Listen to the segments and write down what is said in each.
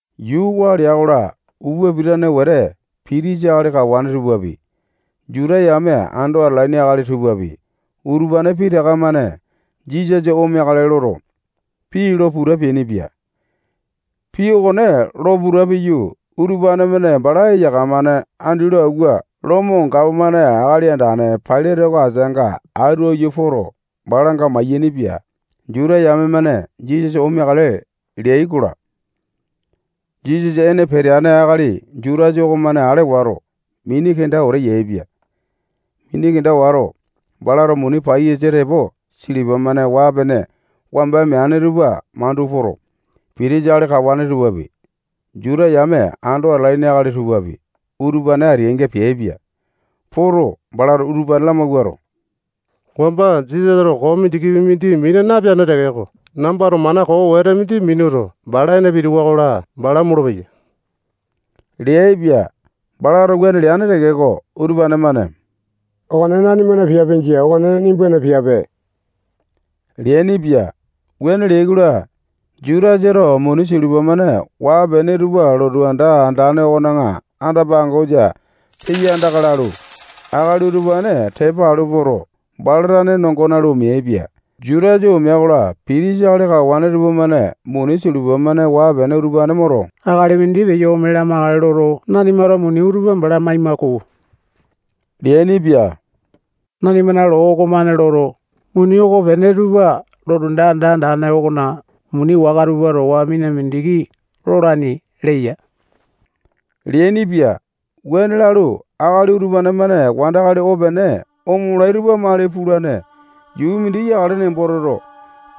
Yuu waa lea-kola, upa pitane wete pitisa akali kawane tupapi, Juta yame ando atalaini akali tupapi, utupane pitaka-mane Jisasa omeakale loto, pii lo puta peainipia. Pii okone lo puta piyu, utupane-mane bala eyaka-mane andi lo awua, Lomo gapomane akali andane Pailate oko ateanga atu aiyu poto, balanga mayainipia. Juta yame-mane Jisasa omeakale leai-kola, Jisasa ene peteane akali Jutasa okomane ale wato, mini kenda wete yaepia. Mini kenda wato, balato muni paiyasa tepo silipa-mane waa-pene wamba meane tupa mandu poto, pitisa akali kawane tupapi, Juta yame ando atalaini akali tupapi, utupane ateainga peaipia. Poto, balato utupane lamawuato, wamba Jisasato koo mindikipi mindi napeane tekeko, nambato mana koo wete mindi minuto, bala ene pitiwa-kola, bala omolo-peya leaipia. Balato wuane leane tekeko, utupane-mane okone nanimana piape jia. Okone nimbana piape leainipia. Wuane leai-kola, Jutasato muni silipa-mane waa-pene tupa lotu anda andane okona anda-pangosa peya andaka lalu, akali utupane tepa alu poto, bala tane nongo nalu, omeaipia. Jutasa omea-kola, pitisa akali kawane tupamane muni silipa-mane waa-pene utupane moto, akali mindi peyo ome lamakale loto, nanimato muni utupa bala maima-ko leainipia. Nanimana loo okomane loto, muni okopene tupa lotu anda andane okona muni waka tupa towa mina mindiki lolaini leya leainipia. Wuane lalu, akali utupane-mane wandakali opene omolai tupa mali pulane yuu mindi yakale nembo toto,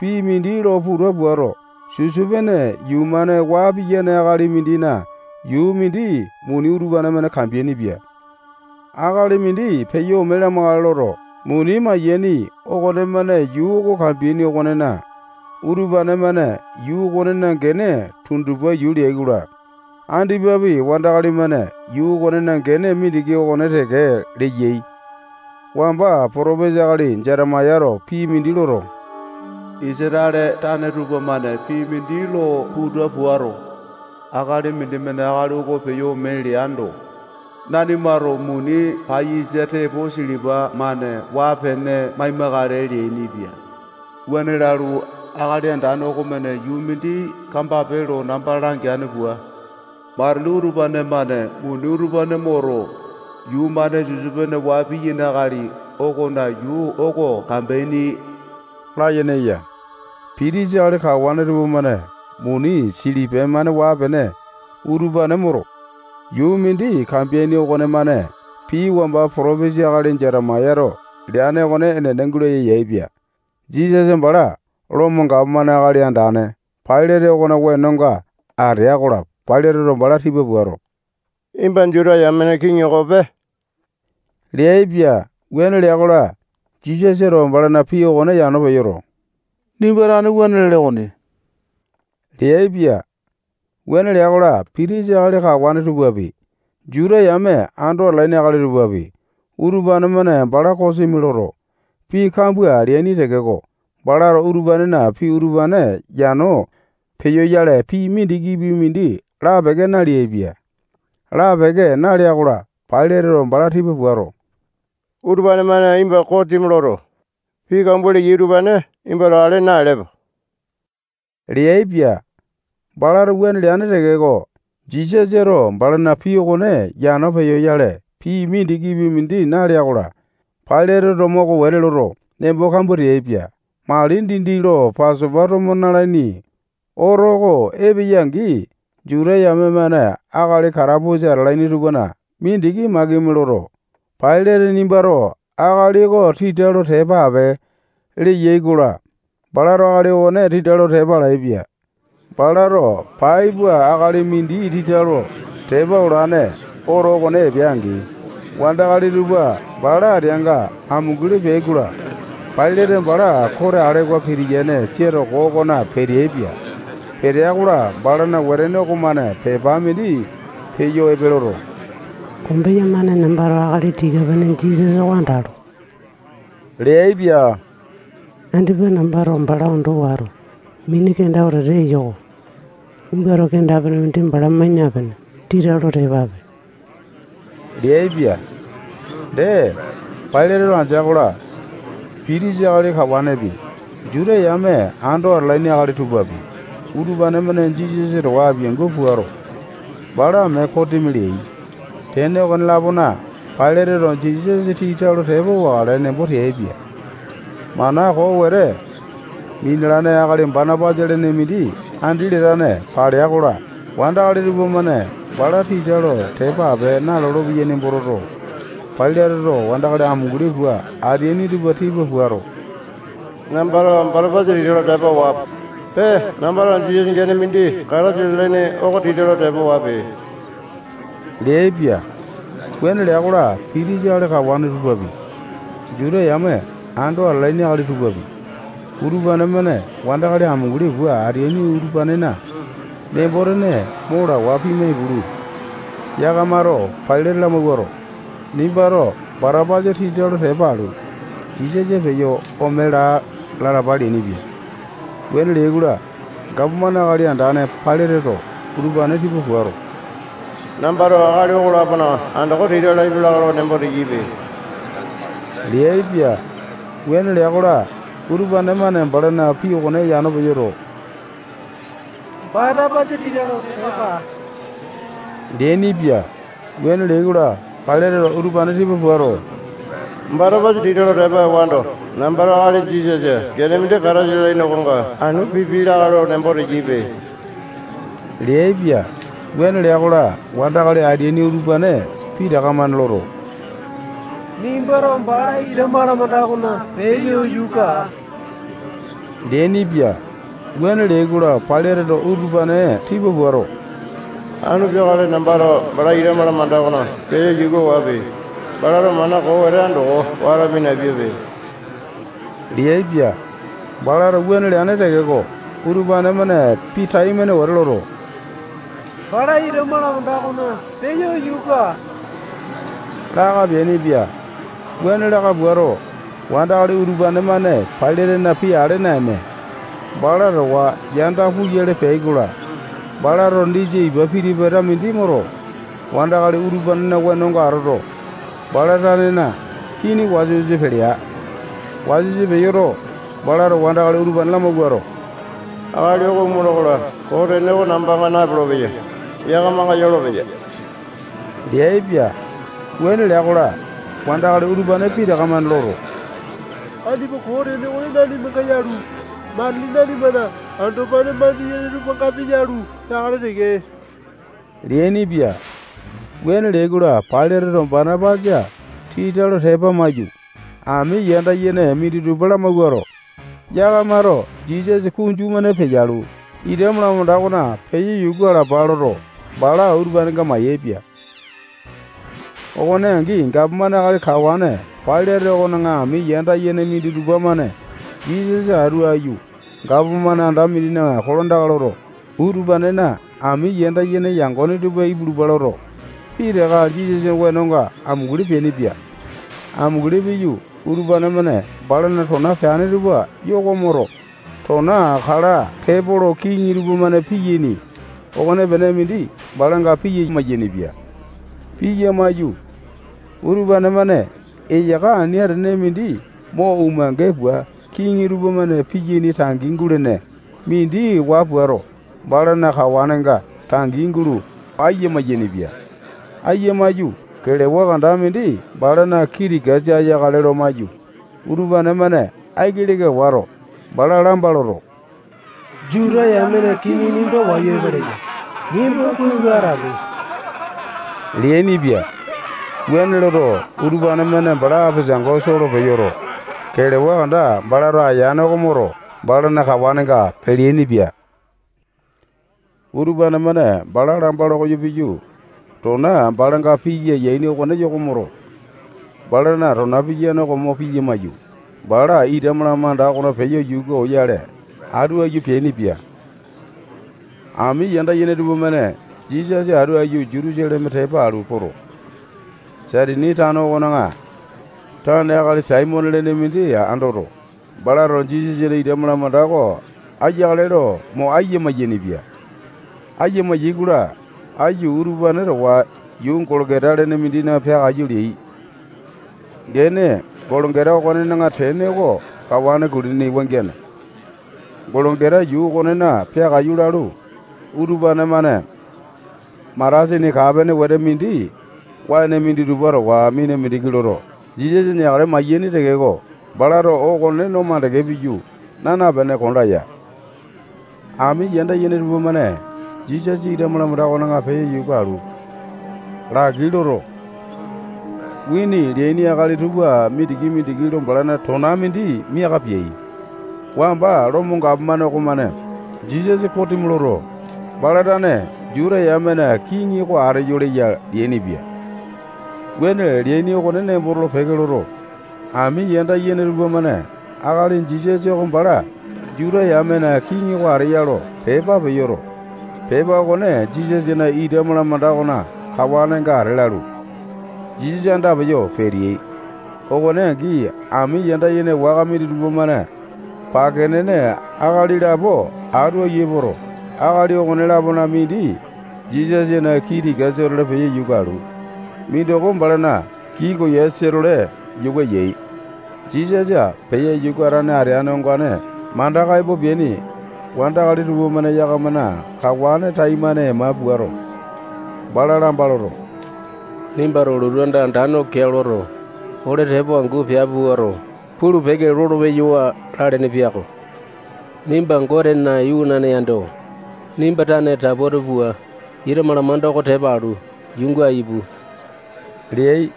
pii mindi lo puta puato, sisopene yuu-mane waa piyane akali mindina yuu mindi muni utupane-mane kambeainipia. Akali mindi peyo ome lamakale loto, muni mayaini okonemane yuu oko kambeaini okonena, utupane-mane yuu okonena gene tundupa yuu leai-kola, andipapi wandakali-mane yuu okonena gene mindiki okone teke leyai. Wamba potopesa akali Jetemayato pii mindi loto, Isatale tane tupamane pii mindi lo puta puato, akali mindimane akali oko peyo ome leando, nanimato muni paiyasa tepo silipa-mane waa-pene maimakale leainipia. Wuane lalu, Akali Andane okomane yuu mindi kambape lo namba langeane pua, matili utupane-mane muni utupane moto, yuu-mane sisopene waa piyane akali okona yuu oko kambeaini layene eya. Pitisa akali kawane tupamane muni silipa-mane waa-pene utupane moto, yuu mindi kambeaini okonemane pii wamba potopesa akali Jetemayato leane okone enene gulaya yaepia. Jisasa bala Lomo gapomane akali andane Pailate okona wenonga atea-kola, Pailateto bala tipa puato, nimba Juta yamena kiŋi okope leaipia. Wuane lea-kola, Jisasato balana pii okone yano peyoto, nimba tane wuane lele okoni leaipia. Wuane lea-kola, pitisa akali kawane tupapi, Juta yame ando atalaini akali tupapi, utupane-mane bala kosimi loto, pii kambua leaini tekeko, balato utupanena pii utupane yano peyoyale, pii mindikipi mindi lapeke naleaipia. Lapeke nalea-kola, Pailateto bala tipa puato, utupane-mane nimba kosimi loto, pii kambua leyai utupane nimbato ale naelepe leaipia. Balato wuane leane tekeko, Jisasato balana pii okone yano peyoyale, pii mindikipi mindi nalea-kola, Pailateto moko wete loto, nembo kambua teaipia. Mali dindi lo Pasopa tomo nalaini oto oko epeya-angi, Juta yame-mane akali katapusa atalaini tupana mindiki makimi loto, Pailate nimbato akali oko tita lo tepa ape leyai-kola, balato akali okone tita lo tepa alaepia. Balato pai pua akali mindi tita lo tepa olane oto okone epea-angi, wandakali tupa bala ateanga amunguli peai-kola, Pailate bala kote alewa pitiyane sia toko okona peteaipia. Petea-kola, balana wetene okomane pepa mindi peyo epe loto, kombeya-mane nambato akali tika-pene Jisasa oko andalo leaipia. Andipa nambato bala ondo wato, mini kenda wete eyo-ko. Nimbato kenda-pene mindi bala mai napene, tita lo tepa ape leaipia. Dee, Pailateto andea-kola, pitisa akali kawanepi, Juta yame ando atalaini akali tupapi, utupane-mane Jisasa towa apiangu puato, bala mee kosimi leai. Tene okone-lapona, Pailateto Jisasa tita lo tepa wakale nembo teaipia. Mana koo wete minalane akali Batapasa lene mindi andi latane palea-kola, wandakali tupamane bala tita lo tepa ape nalolo-peyai nembo toto, Pailateto wandakali amunguli pua ateaini tupa tipa puato, nambato Batapasa tita lo tepa wape. Pee, nambato Jisasa gene mindi Kataisa lalaini oko tita lo tepa wape leaipia. Wuane lea-kola, pitisa akali kawane tupapi, Juta yame ando atalaini akali tupapi, utupane-mane wandakali amunguli pua ateaini utupanena nembo-tene mo lawa pimai-pulu, yakamato Pailate lamawuato, nimbato Batapasa tita lo tepa alu, Jisasa peyo ome laa lalapa leainipia. Wuane leai-kola, gapomane akali andane Pailateto utupane tipa puato, nambato akali okolapona andoko tita lapia lakae lo nembo teyaipe leaipia. Wuane lea-kola, utupane-mane balana pii okone yano peyoto, Batapasa tita lo tepa aa leainipia. Wuane leai-kola, Pailateto utupane tipa puato, Batapasa tita lo tepa ewando, nambato akali Jisasa gene mindi Kataisa lalaini okonga anu pipia lakae lo nembo teyaipe leaipia. Wuane lea-kola, wandakali ateaini utupane pitaka-mane loto, nimbato bala ita malamanda okona peyo yuka aa leainipia. Wuane leai-kola, Pailateto utupane tipa puato, anu peakale nambato bala ita malamanda okona peyo yuka wape. Balato mana koo wete andoko wato minapiape leaipia. Balato wuane leane tekeko, utupane-mane pii taimane wete loto, bala ita malamanda okona peyo yuka aa laka peainipia. Wuane laka puato, wandakali utupa-mane Pailatena pii ale naene, bala towa yanda puyale peyai-kola, balato disa ipa piti-pata mindi moto, wandakali utupanena wenonga atoto, bala tanena kini wasa-wasa pelea. Wasa-wasa peyoto, balato wandakali utupane lamawuato, akali oko omola-kola, koo tene oko nambanga nayolopeya. Yakamanga yolopeya leaipia. Wuane lea-kola, wandakali utupane pitaka-mane loto, andipa koo tene okone nanimanga yalu, matili nanimana andopane mandiyene tupangapi yalu, peakale teke leainipia. Wuane leai-kola, Pailateto Batapasa tita lo tepa amaiyu, ami yanda yene minditupa lamawuato, yakamato Jisasa kunju-mane peyalu, ita malamanda okona peyo yuka alapa loto, bala utupanenga mayaepia. Okone angi, gapomane akali kawane Pailate okona ami yanda yene minditupa-mane Jisasa atu aiyu gapomane anda mindina kolandaka loto, utupanena ami yanda yene yangone tupa ipulupa loto, pitaka Jisasana wenonga amunguli peainipia. Amunguli piyu, utupane-mane balana tona peane tupa yoko moto, tona kala pepolo kiŋi tupamane piyaini okonepene mindi balanga piya mayainipia. Piya maiyu, utupane-mane eyaka ani atene mindi mo umange pua kiŋi tupamane piyaini tangi gulene mindi waa puato, balana kawanenga tangi gulo aiya mayainipia. Ayia maiyu, kelewa kanda mindi balana kii tikasa aiyakale lo maiyu, utupane-mane aiki leka wato, bala lamba loto, Juta yamena kiŋi nimba wayu epeleya. Nimba kuai lo atape leainipia. Wuane loto, utupane-mane bala apesango soo lo peyoto, kelewa kanda balato aiyane okone moto, balana kawanenga peleaini-pia. Utupane-mane bala lamba lo koyo piyu, tona balanga piya mayaini okone yoko moto, balana tona piyane oko mo piya maiyu, bala ita malamanda okona peyo yuka oyale atu aiyu peainipia. Ami yanda yene tupamane Jisasa atu aiyu Jutusaleme tepa alu poto, Saitini tano okona tane akali Saimone lene mindi andoto, balato Jisasana ita malamanda oko aiyakale lo mo aiya mayainipia. Aiya mayai-kola, aiyu utupane towa yuu Golokota lene mindina peakaiyu leai. Gene Golokota okonena tene oko kawane kulini wangiane. Golokota yuu okonena peakaiyu lalu, utupane-mane matasini kaa-pene wete mindi waene minditupa towa mina mindiki loto, Jisasa neakale mayaini tekeko, balato okone no makande piyu, naa napene, konda ya. Ami yanda yene tupamane Jisasa ita malamanda okona peyo yuka alu, laki loto, wini leaini akali tupa mindiki-mindiki lo balana tona mindi miaka peai. Wamba Lomo gapomane okomane Jisasa kosimi loto, bala tane Juta yamena kiŋi oko ateyo leya leainipia. Wuane leaini oko nembo tolo-peke loto, ami yanda yene tupamane akali Jisasa oko bala Juta yamena kiŋi oko ateya lo pepa peyoto, pepa okone Jisasana ita malamanda okona kawanenga ate lalu, Jisasa andapeyo peteai. Okone angi, ami yanda yene waka minditupa-mane pake nene akali lapo atu aiyu epoto, akali okone-lapona mindi Jisasana kii tikasa-tole peyo yuka alu, mindoko balana kii koyasa-tole yuka yai. Jisasa peyo yuka atane ateane ongane mandaka epo peaini wandakali tupamane yakamana kawane taimane ema puato, bala lamba loto, nimbato lotu anda andane oko keao loto, ole tepo angu piape puato, pulu-peke lolo-peyawa lalene piako. Nimba Gotena iwanane yando, nimba tane taputi pua, ita malamanda oko tepa alu, yuunga ipu leai.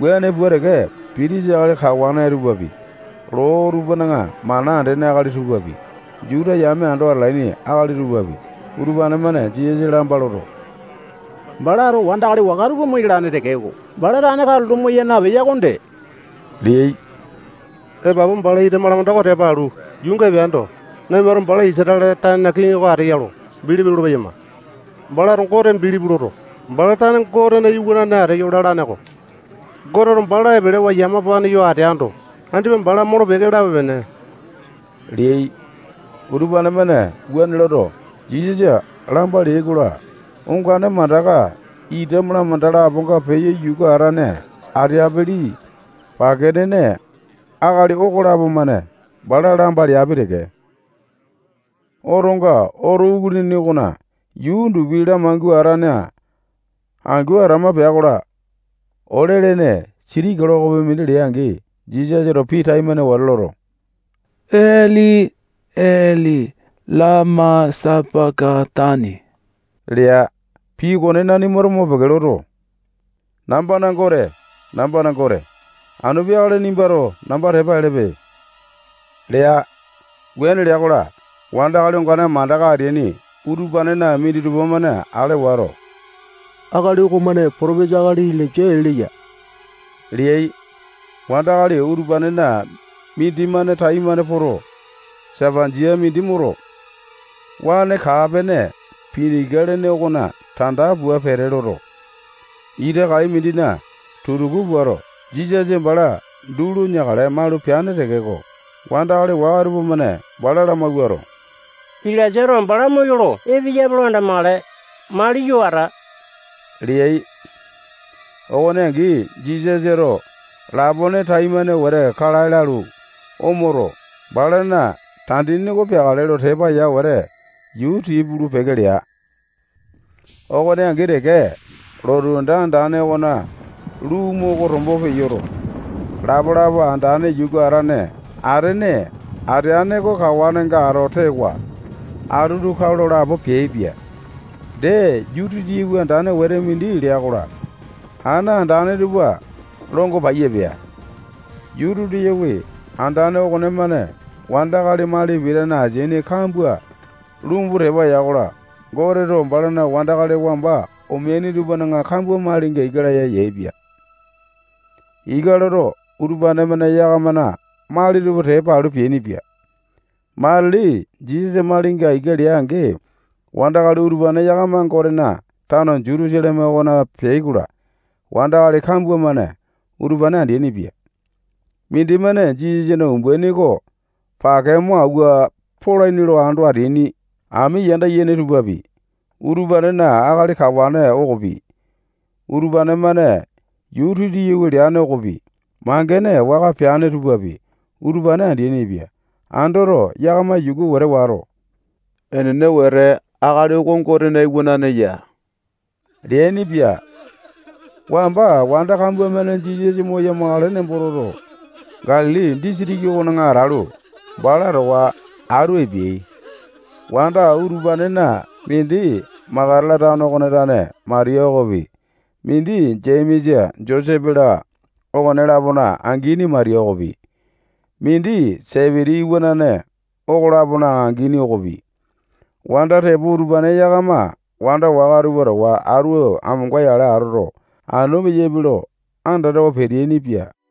Wuane pua teke, pitisa akali kawane tupapi, loo tupana mana andene akali tupapi, Juta yame ando atalaini akali tupapi, utupane-mane Jisasa lamba loto, balato wandakali waka tupa moyalane tekeko, bala tane katulo moya napeya okonde leai. Epapu bala ita malanda oko tepa alu, yuunga epeando, nanimato bala Isatale tanena kiŋi oko ateya lo bilipi lolo-peyama. Balato Gote bilipi loto, bala tane Gotena iwanane ateyo lalane-ko. Goteto bala epelewa yamapane yo ateando, andipa bala molo-peke lape-pene leai. Utupane-mane wuane loto, Jisasa lamba leai-kola, ongane mandaka ita malamanda laponga peyo yuka atane ateapili pake nene akali okolapo-mane bala lamba leapi teke. Otonga oto kulini okona yuu undupi lamangua atane angu atama pea-kola, ole-lene siti kilokopi mindi lea-angi, Jisasato pii taimane wete loto, Eli, Eli lama sapa-katani lea. Pii okone nanimato mopeke loto, nambana Gote, nambana Gote, anu peakale nimbato namba tepa elepe lea. Wuane lea-kola, wandakali ongane mandaka ateaini utupanena minditupa-mane ale wato, akali okomane potopesa akali Ilainja ee leya leai. Wandakali utupanena mindimane taimane poto, sapanjia mindi moto, waene kaa-pene pinika lene okona tanda pua pete loto, ita kai mindina tutuku puato, Jisasa bala duu lo neakale maulu peane tekeko, wandakali waka tupamane bala lamawuato, Ilainjato bala moyolo epeyape lo andamakale. Mali yo ata leai. Okone angi, Jisasato lapone taimane wete kalae lalu, omoto, balana tandini oko peakale lo tepa ya wete, yuu tii pulu-peke lea. Okone angi teke, lotu anda andane okona lumu oko tombo peyoto, lapa-lapa andane yuka atane ateane oko kawanenga ato tewa, atutu kao lo lapo peaipia. Dee, yuu titiyawi andane wete mindi lea-kola, ana andane tupa longo paiya pea. Yuu titiyawi andane okonemane wandakali mali pitane asini kambua lumbu tepa ya-kola, Goteto balana wandakali wamba omeaini tupana kambua malinga ika laya yaepia. Ika loto, utupane-mane yakamana mali tupa tepa alu peainipia. Matili Jisasa malinga ika lea-angi, wandakali utupane yakama Gotena tano Jutusaleme okona peai-kola, wandakali kambua-mane utupane andeaini-pia. Mindimane Jisasana umbaini oko pake mo awua polaini lo ando ateaini ami yanda yene tupapi, utupanena akali kawane okopi, utupane-mane yuu titiyawi leane okopi, mangene waka peane tupapi, utupane andeaini-pia. Andoto, yakama yuku wete wato, enene wete, akali oko Gotena Iwanane ya leainipia. Wamba wanda kambua-mane Jisasa moya-makale nembo toto, Galili disitiki okona atalu, bala towa atu epeai. Wanda utupanena mindi Makatala tano okona tane Matiya okopi, mindi Jemesa, Josepe-la, okone-lapona angini Matiya okopi, mindi Sepiti iwanane okolapona angini okopi, wanda tepo utupane yakama wanda waka tupa towa atu amonga-yale atoto, anu peyaipe lo andatawa peteaini-pia.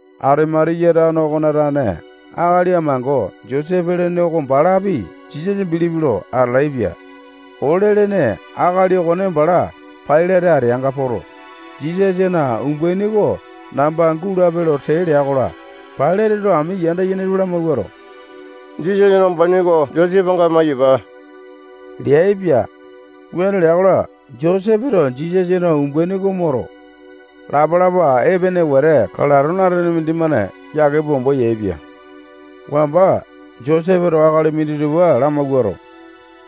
Atimatiya tano okona tane akali amango Josepe lene oko balapi Jisasa bilipi lo atalaepia. Ole-lene akali okone bala Pailate ateanga poto, Jisasana umbaini oko namba gulape lo tee lea-kola, Pailateto ami yanda yene tupa lamawuato, Jisasana umbaini oko Josepenga maiyapa leaipia. Wuane lea-kola, Josepeto Jisasana umbaini oko moto, lapa-lapa epene wete kalato naene mindimane yake pua ombo yaepia. Wamba Josepeto akali minditupa lamawuato,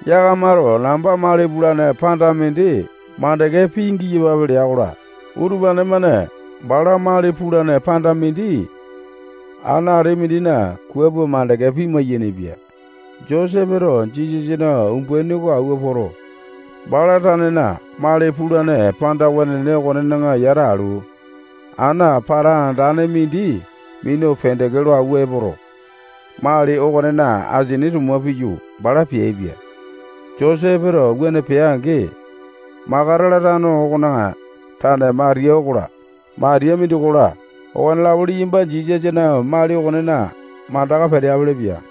yakamato namba mali pulane panda mindi mandeke pingiyapape lea-kola, utupane-mane bala mali pulane panda mindi ana ati mindina kua pua mandeke pima-yainipia. Josepeto Jisasana umbaini oko awua poto, bala tanena mali pulane panda wenene okonena yata alu, ana pata andane mindi minu pendeke lo awua epoto, mali okonena asini tuma piyu, bala peaipia. Josepeto wuane pea-angi, Makatala tano okona tane Matiya okola, Matiya mindi okola, okonelapo liyamba Jisasana mali okonena mandaka peteapele-pia.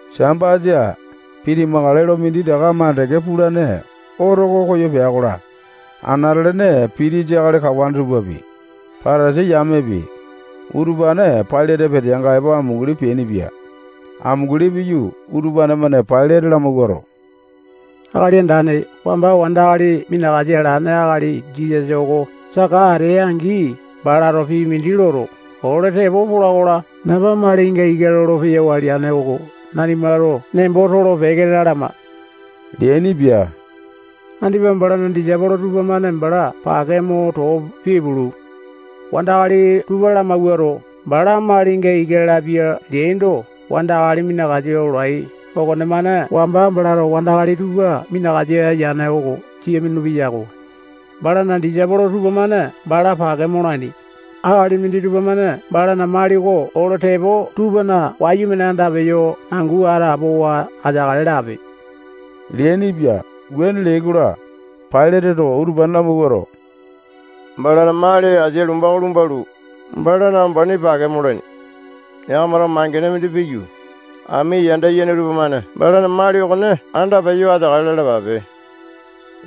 Sambasa pitimakale lo minditaka makande pulane oto oko koyo pea-kola, anate-lene pitisa akali kawane tupapi, Patasai yamepi, utupane Pailate peteanga epo amunguli peainipia. Amunguli piyu, utupane-mane Pailate lamawuato, akali andane, wamba wandakali minakasa alane akali Jisasa oko saka atea-angi, balato pii mindi loto, ole tepo pola-kola, namba malinga ika lolo-peyawa leane oko nanimato nembo tolo-peke lalama leainipia. Andipa balana disaipolo tupamane bala pake mo too pipulu, wandakali tupa lamawuato, bala malinga ika lapia leaindo, wandakali minakasa olai okonemane wamba balato wandakali tupa minakasa yane oko sia minulu-peyako. Balana disaipolo tupamane bala pake molaini. Akali minditupa-mane balana mali oko ole tepo tupana wayumane andapeyo angu atapowa ateakale lape leainipia. Wuane leai-kola, Pailateto utupane lamawuato, balana mali asia lomba oko lumbalu, balana umbaini pake molaini. Yakamato mangene mindi piyu, ami yanda yene tupamane balana mali okone andapeyo ateakale lalapape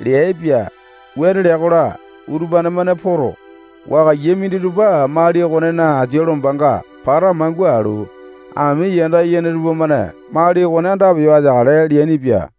leaipia. Wuane lea-kola, utupane-mane poto, wakaiya minditupa mali okonena asia lombanga pata mangua alu, ami yanda yene tupamane mali okone andapeyo ateakale leainipia.